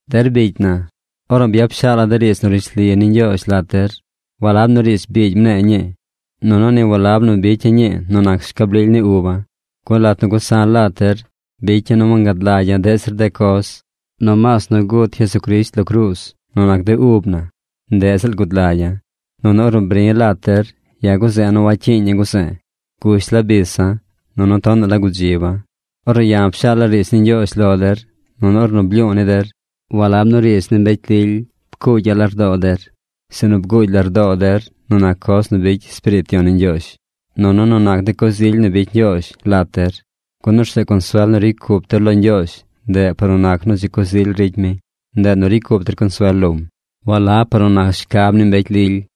Der bicy na, ornu byap shaala̱ de riidz nu rishli ni Ñgyoozh lat der, walab nu riidz biigy mne̱e̱ ñii. Nunu ni walab nu bicya̱ ñii nu nac schab lily ni uba̱. Gun lat nu gusa̱ lat der, bicya̱ nu wangad lagya̱ deꞌ zir de coz, nomaas nu gut Jesucrisht lo cruuz nu nac de ub na, ndeꞌ ziꞌl gud lagya̱. Nunu ornu bri̱ lat der, ya̱ guze̱e̱ nu wacyiiña̱ guze̱e̱. Gush la bisa̱, nunu tonaꞌ la gudziba̱. Ornu ya̱ pshaala̱ riidz ni Ñgyoozh lo der, nunu ornu blyu̱u̱ ni der, walab nu riidz ni mbecy lily pcuugya̱ lardoo der, sinu bguugy lardoo der nu nac coz nu bicy Espiriit Yon ni Ñgyoozh, nunu nu nac de coz ily nu bicy Ñgyoozh lat der. Gun orzeꞌ consuel nu ricy cup der lo Ñgyoozh ndeꞌ par nu nac nu dzi coz ily ricy mi, ndeꞌ nu ricy cup der consuel lom, walab par nu nac shcab ni mbecy lily.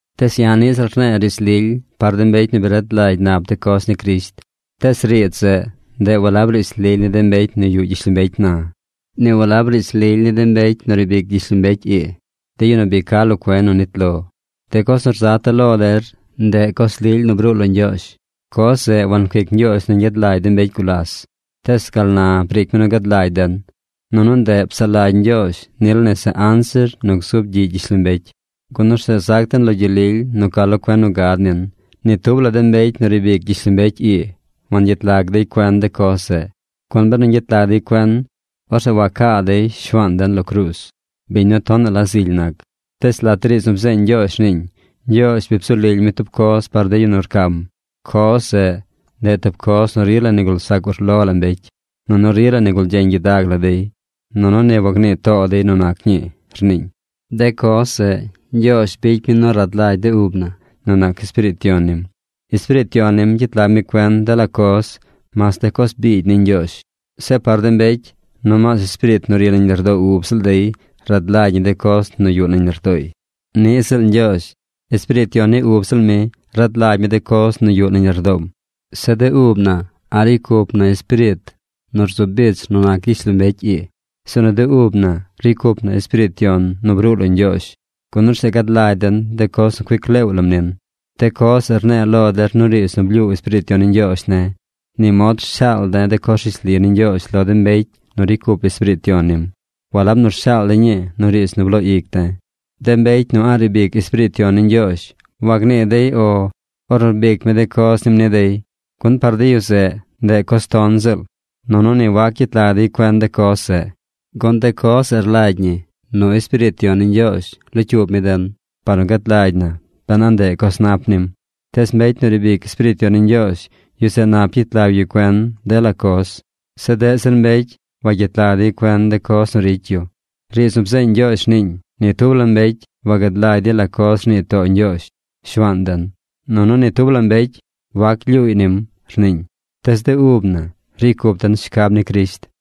Tees ya̱ niꞌ ziꞌl rne̱e̱ riidz lily par de mbecy nu bi rad lagy nap de coz ni Crisht. Tees riidz zeꞌ, ndeꞌ walab riidz lily ni de mbecy nu yuꞌ gyishlombecy na. Ni walab riidz lily ni de mbecy nu riib ic gyishlombecy ii, de yu nu bi ca lo cuen nu nit lo. De coz nu rzata̱ lo der, ndeꞌ coz lily nu bruu lo Ñgyoozh. Coz zeꞌ wancuic Ñgyoozh nu ñgyad lagy de mbecy gulas tees gal na briic mi nu gad lagy den. Nunu ndeꞌ psaꞌ lagy Ñgyoozh nil nese anzir nu gzub gyiꞌ gyishlombecy gun orzeꞌ zac den lo gyel lily nu ca lo cuen nu gad nin. Ni tub la de mbecy nu riib ic gyishlombecy ii wangyet lag dey cuen de coz zeꞌ, gun benu ñgyet lag dey cuen, orzeꞌ wacaa dey Shuaan den lo cruuz, biñ nu tonaꞌ la zily nac. Tees lat de riidz nu bzeeñ Ñgyoozh rniiñ: Ñgyoozh bi bzu lily mi tub coz par de yu nu rcam. Coz zeꞌ, ndeꞌ tub coz nu rila nigul zac ur lo la mbecy, nunu rila nigul gyeñ gyidag la dey, nunu ni wagnii too dey nu nac ñii, rniiñ. De coz zeꞌ Ñgyoozh bicy mi nu rad lagy de ub na nu nac Espiriit Yon nim. Espiriit Yon nim gyet lag mi cuen dela coz, mas de coz biigy ni Ñgyoozh. Zeꞌ par de mbecy, nomaas espiriit nu ri nañ lardoo ub ziꞌl dey rad lagy ñi de coz nu yuꞌ nañ lardooy. Niꞌ ziꞌl Ñgyoozh. Espiriit Yon ni ub ziꞌl mi rad lagy mi de coz nu yuꞌ nañ lardoom. Zeꞌ de ub na a̱ꞌ ricy cup na espiriit nu rzu bich nu nac gyishlombecy ii, sinu de ub na ricy cup na Espiriit Yon nu bruu lo Ñgyoozh. Gun orzeꞌ gad lagy den de coz nu cuic leew lam nin. De coz zeꞌ rne̱e̱ lo der nu riidz nu blyuu Espiriit Yon ni Ñgyoozh ne̱. Ni mod rshaal de̱ de coz rishli ni Ñgyoozh lo de mbecy nu ricy cup Espiriit Yon nim. Walab nu rshaal de̱ ñii nu riidz nu bloo ic de̱. De mbecy nu a̱ꞌ riib ic Espiriit Yon ni Ñgyoozh, wagnii dey “O” ornu rbic mi de coz nim ni dey, gun par de yu zeꞌ, ndeꞌ coz ton ziꞌl. Nunu ni wac gyet lag dey cuen de coz zeꞌ, gun de coz zeꞌ rlagy ñi nu Espiriit Yon ni Ñgyoozh locyuub mi den, par nu gad lagy na ben a ndeꞌ coz nap nim. Tees mbecy nu riib ic Espiriit Yon ni Ñgyoozh, yu zeꞌ nap yet lag yu cuen dela coz. Zeꞌ deꞌ zir mbecy wagyet lag dey cuen de coz nu ricy yu. Riidz nu bzeeñ Ñgyoozh rniiñ: Ni tub la mbecy wagad lagy dey la coz rnii too Ñgyoozh, Shuaan den. Nunu ni tub la mbecy wac glyuuy nim, rniiñ. Tees de ub na ricy cup den shcab ni Crisht.